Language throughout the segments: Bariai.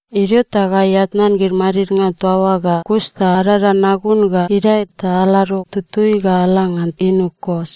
Idio ta gai atnan gid madidnga toa oa ga kus ta adada nagun ga idae ta alado tutui ga ala ngan inu Kos.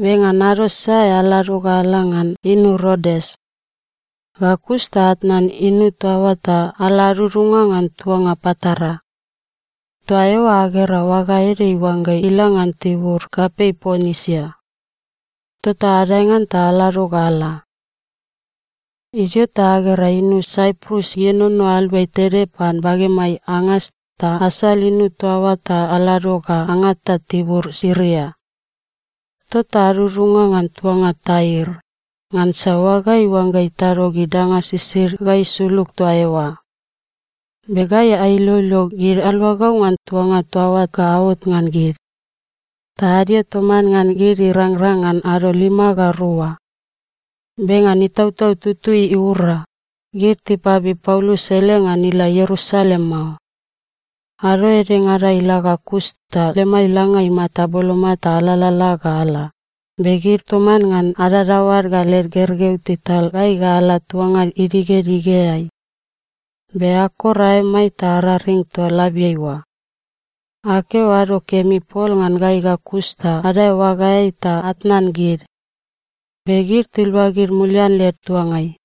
Be ngan ado sae alado ga ala ngan inu Rodes. Ga kus ta atnan inu toa oa ta ala adudunga ngan tuanga Patara. Toa eoa agera oaga ede iuangga ila ngan tibur kapei Ponisia. Tota adae ngan ta alado ga ala. Idio ta agera inu Saiprus ienono aluai tede pan bagemai angas ta asal inu toa oa ta alado ga angata tibur Siria. Tota adudunga ngan tuanga Tair, ngansa oaga iuangga itado gid danga sisid ga isulug toa eoa. Be gai ailoilo gid aluagau ngan tuanga toa oa ga aot ngan gid. Ta adio toman ngan gid irangrang ngan ado lima ga rua. Be ngan Itautau Tutui iura, gid tipabib Paulus ele ngan ila Ierusalem mao. Ado edengada ila ga kus ta lemai langa imata boloma ta alalala ga ala, be gid toman ngan adadaoad ga led gergeu tital gai ga ala tuanga idigedigeai. Be akor aemai ta araring toa labiai oa. Akeo “ado kemi” pol ngan gai ga kus ta adae oagaeai ta atnan gid. Be gid tiluagid mulian led tuangai.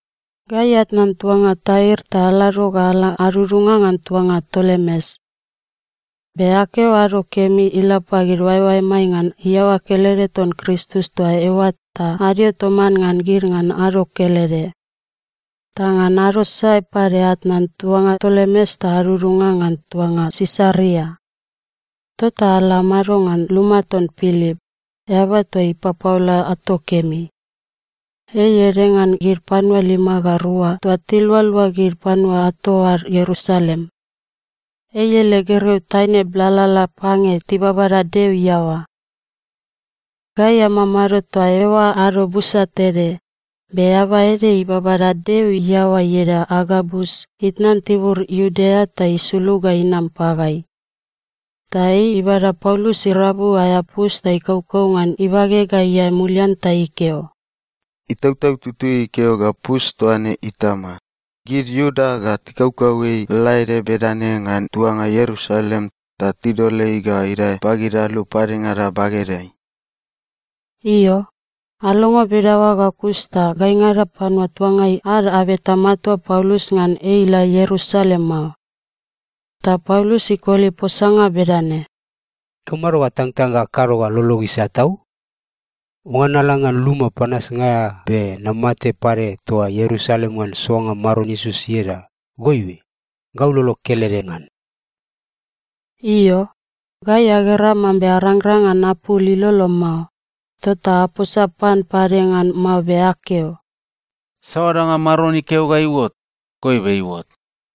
Gai atnan tuanga Tair ta alado ga ala adudunga ngan tuanga Tolemes. Be akeo “ado kemi” ila pagid oaeoaemai ngan iaoa kelede ton Kristus toa eoa ta adio toman ngan gid ngan ado kelede. Ta ngan ado sae pade atnan tuanga Tolemes ta adudunga ngan tuanga Sisaria. Tota ala amado ngan luma ton Pilip, eaba toa ipapaola ato kemi. Ei ede ngan gid panua lima ga rua toa tilualua gid panua ato ad Ierusalem. Ei ele gergeu taine blalala pange tibabada Deo iaoa. Gai amamado toa eoa ado busa tede, be eaba ede ibabada Deo iaoa ieda Agabus itnan tibur Iudea ta isulug ga inam pagai. Ta ei ibada Paulus irabu aea pus ta ikaukau ngan ibage ga iae mulian ta ikeo, “Itautau Tutui ikeo ga pus toa ne itama, gid Iuda ga tikaukau ei lalaede bedane ngan tuanga Ierusalem ta tidol ei ga idae pagid alu padengada bagedeai.” Io, alongo bedaoa ga kus ta gaingada panua tuangai ad abeta matua Paulus ngan ei ila Ierusalem mao. Ta Paulus ikoli posanga bedane, “Ikamado atangtang ga akado ga lolog isat tau? Oangga nala ngan luma panasnga aea be namate pade toa Ierusalem ngan soanga Maron Iesus ieda, goibe gau lolog kelede ngan.” Io, gai agera mambe arangrang ngan apul ilolo mao, tota aposa pan pade ngan mao be akeo, “Saoa danga Maron ikeo ga iuot, goibe iuot.”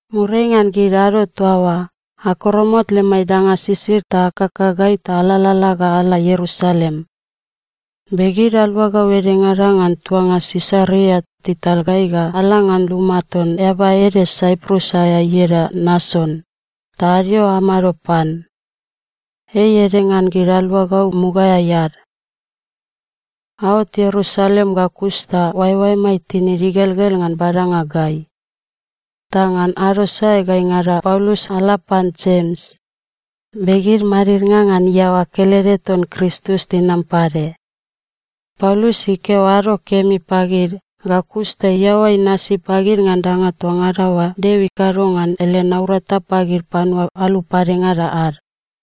Muriai ngan gid ado toa oa, akoromot lemai danga sisid ta akakagai ta alalala ga ala Ierusalem. Be gid aluagau edengada ngan tuanga Sisaria tital gai ga ala ngan luma ton eaba ede Saiprus aea ieda Nason, ta adio amado pan. Ei ede ngan gid aluagau mugaeai ad. Aot Ierusalem ga kus ta oaeoaemai tinid igelgel ngan badanga gai. Ta ngan ado sae gaingada Paulus ala pan Jems, be gid madidnga ngan iaoa kelede ton Kristus tinam pade. Paulus ikeo “ado kemi” pagid ga kus ta iaoa inasi pagid ngan danga toa ngada oa Deo ikado ngan ele naurata pagid panua alu padengada ad.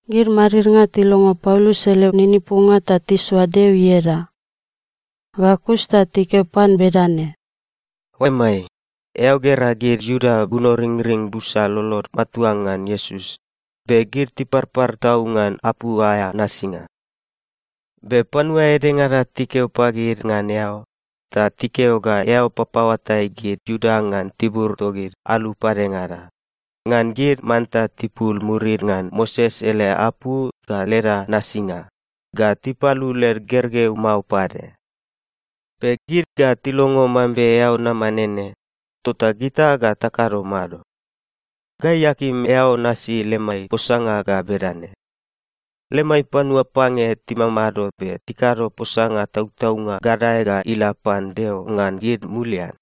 Gid madidnga tilongo Paulus ele ninipunga ta tisoa Deo ieda. Ga kus ta tikeo pan bedane, “Oaemai, eao gera gid Iuda bunoringring busa lolod matua ngan Iesus, be gid tiparpar tau ngan apu aea nasinga. Be panua edengada tikeo pagid ngan eao, ta tikeo ga eao papaoatai gid Iuda ngan tibur togid alu padengada, ngan gid manta tipul murid ngan Moses ele apu ga leda nasinga, ga tipalu led gergeu mao pade. Be gid ga tilongo mambe eao nama nene, tota gita ga takado mado? Gai akim eao nasi lemai posanga ga bedane: Lemai panua pange timamado be tikado posanga tautaunga gadae ga ila pan Deo ngan gid mulian.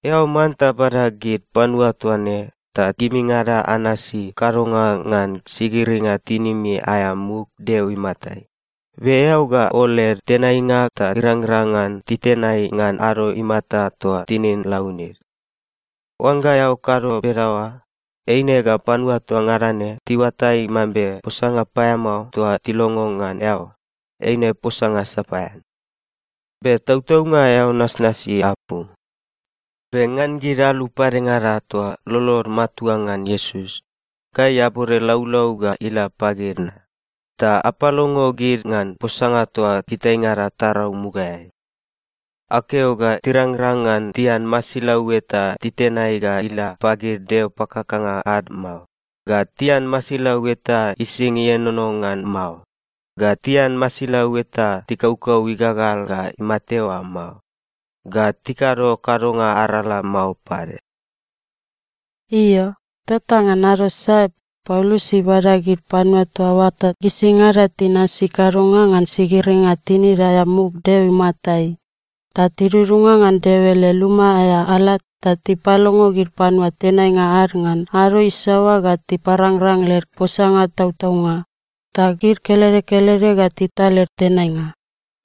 Eao manta bada gid panua toa ne ta gimingada anasi kadonga ngan sigiringa tinimi aea muk Deo imatai, be eao ga ol led tenainga ta irangrang ngan titenai ngan ado imata toa tinin launid. Oangga eao kado bedaoa, eine ga panua toa ngada ne tiuatai mambe posanga paeamao toa tilongo ngan eao, eine posanga sapaean. Be tautaunga eao nasnasi apu. Be ngan gid alu padengada toa lolod matua ngan Iesus, gai abode laulau ga ila pagid na, ta apalongo gid ngan posanga toa gitaingada tarau mugaeai. Akeo ga tirangrang ngan tian masilau eta titenai ga ila pagid deo pakakanga ad mao, ga tian masilau eta ising ienono ngan mao, ga tian masilau eta tikaukau igagal ga imate oa mao, ga tikado kadonga arala mao pade.” Io, tota ngan ado sae Paulus ibada gid panua toa oa ta gisingada tinasi kadonga ngan sigiringa tinid aea muk Deo imatai, ta tidudunga ngan Deo ele luma aea ala ta tipalongo gid panua tenainga ad ngan ado isaoa ga tiparangrang led posanga tautaunga, ta gid kelede kelede ga tital led tenainga.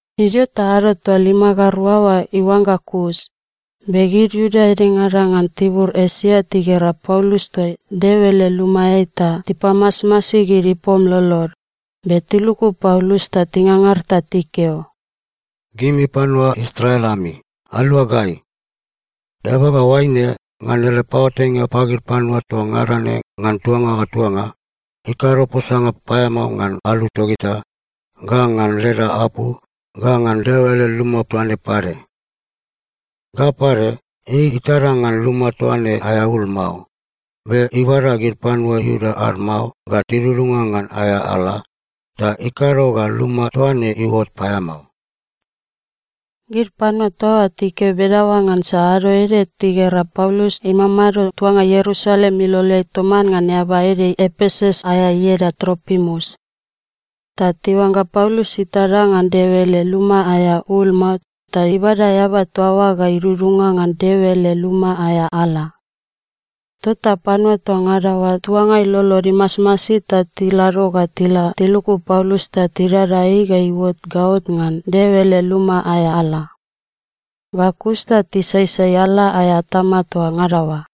Idio ta ado toa lima ga rua oa iuangga kus, be gid Iuda edengada ngan tibur Esia tigera Paulus toa Deo ele lumaeai ta tipamasmasi gid ipom lolod, be tiluku Paulus ta tingangar ta tikeo, “Gimi panua Israel ami, alua gai! Eaba ga oaine, ngan ele paoatainga pagid panua toa ngada ne ngan tuanga ga tuanga, ikado posanga paeamao ngan alu togita, ga ngan leda apu, ga ngan Deo ele luma toa ne pade. Ga pade, ei itada ngan luma toa ne aea ul mao, be ibada gid panua Iuda ad mao ga tidudunga ngan aea ala, ta ikado ga luma toa ne iuot paeamao.” Gid panua toa oa tikeo bedaoa ngansa ado ede tigera Paulus imamado tuanga Ierusalem iloleai toman ngan eaba ede Epesus aea ieda Tropimus. Ta tiuangga Paulus itada ngan Deo ele luma aea ul mao ta ibada eaba toa oa ga idudunga ngan Deo ele luma aea ala. Tota panua toa ngada oa tuangai lolod imasmasi ta tilado ga tila tiluku Paulus ta tidada ei ga iuot gaot ngan Deo ele luma aea ala. Ga kus ta tisaisai ala aea atama toa ngada oa.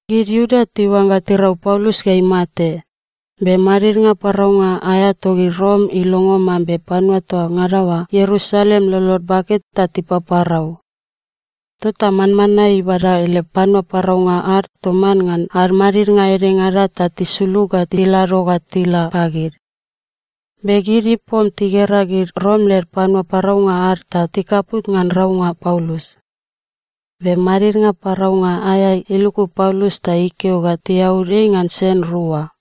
Gid Iuda tiuangga tirau Paulus ga imate, be madidnga paraunga aea togid Rom ilongo mambe panua toa ngada oa Ierusalem lolod bake ta tipaparau. Tota manmanae ibada ele panua paraunga ad toman ngan ad madidnga edengada ta tisulug ga tilado ga tila pagid. Be gid ipom tigera gid Rom led panua paraunga ad ta tikaput ngan raunga Paulus. Be madidnga paraunga aea iluku Paulus ta ikeo ga tiaud ei ngan sen rua.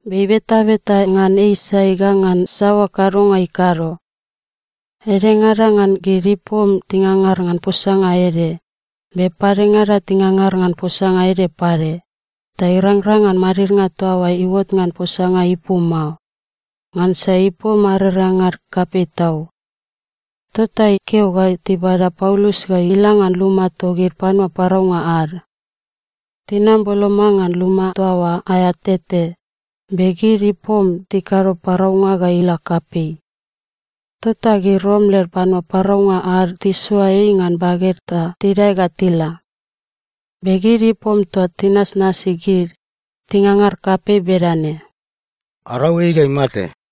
Be ibetabeta ngan ei sai ga ngan saoa kadonga ikado. Edengada ngan gid ipom tingangar ngan posanga ede, be padengada tingangar ngan posanga ede pade, ta irangrang ngan madidnga toa oa iuot ngan posanga ipu mao, ngansa ipom arerengad kapei tau. Tota ikeo ga tibada Paulus ga ila ngan luma togid panua paraunga ad. Tinam boloma ngan luma toa oa aea tete, be gid ipom tikado paraunga ga ila kapei. Tota gid Rom led panua paraunga ad tisoa ei ngan baged ta tidae ga tila. Be gid ipom toa tinasnasi gid, tingangar kapei bedane, “Arau ei ga imate!”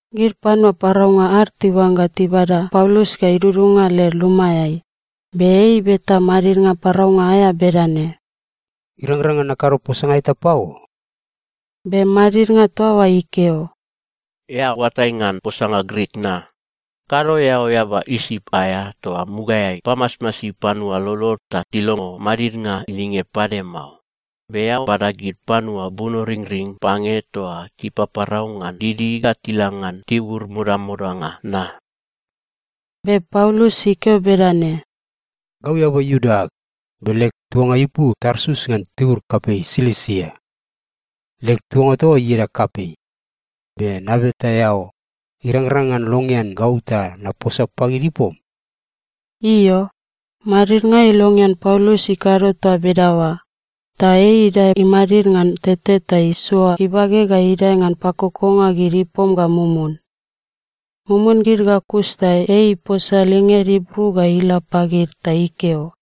Gid panua paraunga ad tiuangga tibada Paulus ga idudunga led lumaeai, be ei ibeta madidnga paraunga aea bedane, “Irangrang ngan nakado posanga eta pago?” Be madidnga toa oa ikeo, “Eao oatai ngan posanga Grik na? Kado eao eaba Isip aea toa mugaeai pamasmasi panua lolod ta tilongo madidnga linged pade mao, be eao bada gid panua bunoringring pange toa tipaparau ngan didi ga tila ngan tibur modamodanga na?” Be Paulus ikeo bedane, “Gau eaba Iuda ag, be leg tuanga ipu Tarsus ngan tibur kapei Silisia. Leg tuanga toa oa ieda kapei. Be nabeta eao, irangrang ngan longean gau ta naposa pagid ipom?” Io, madidnga ilongean Paulus ikado toa bedaoa, ta ei idae imadid ngan tete ta isoa ibage ga idae ngan pakokonga gid ipom ga mumun. Mumun gid ga kus ta ei iposa linged Ibru ga ila pagid ta ikeo,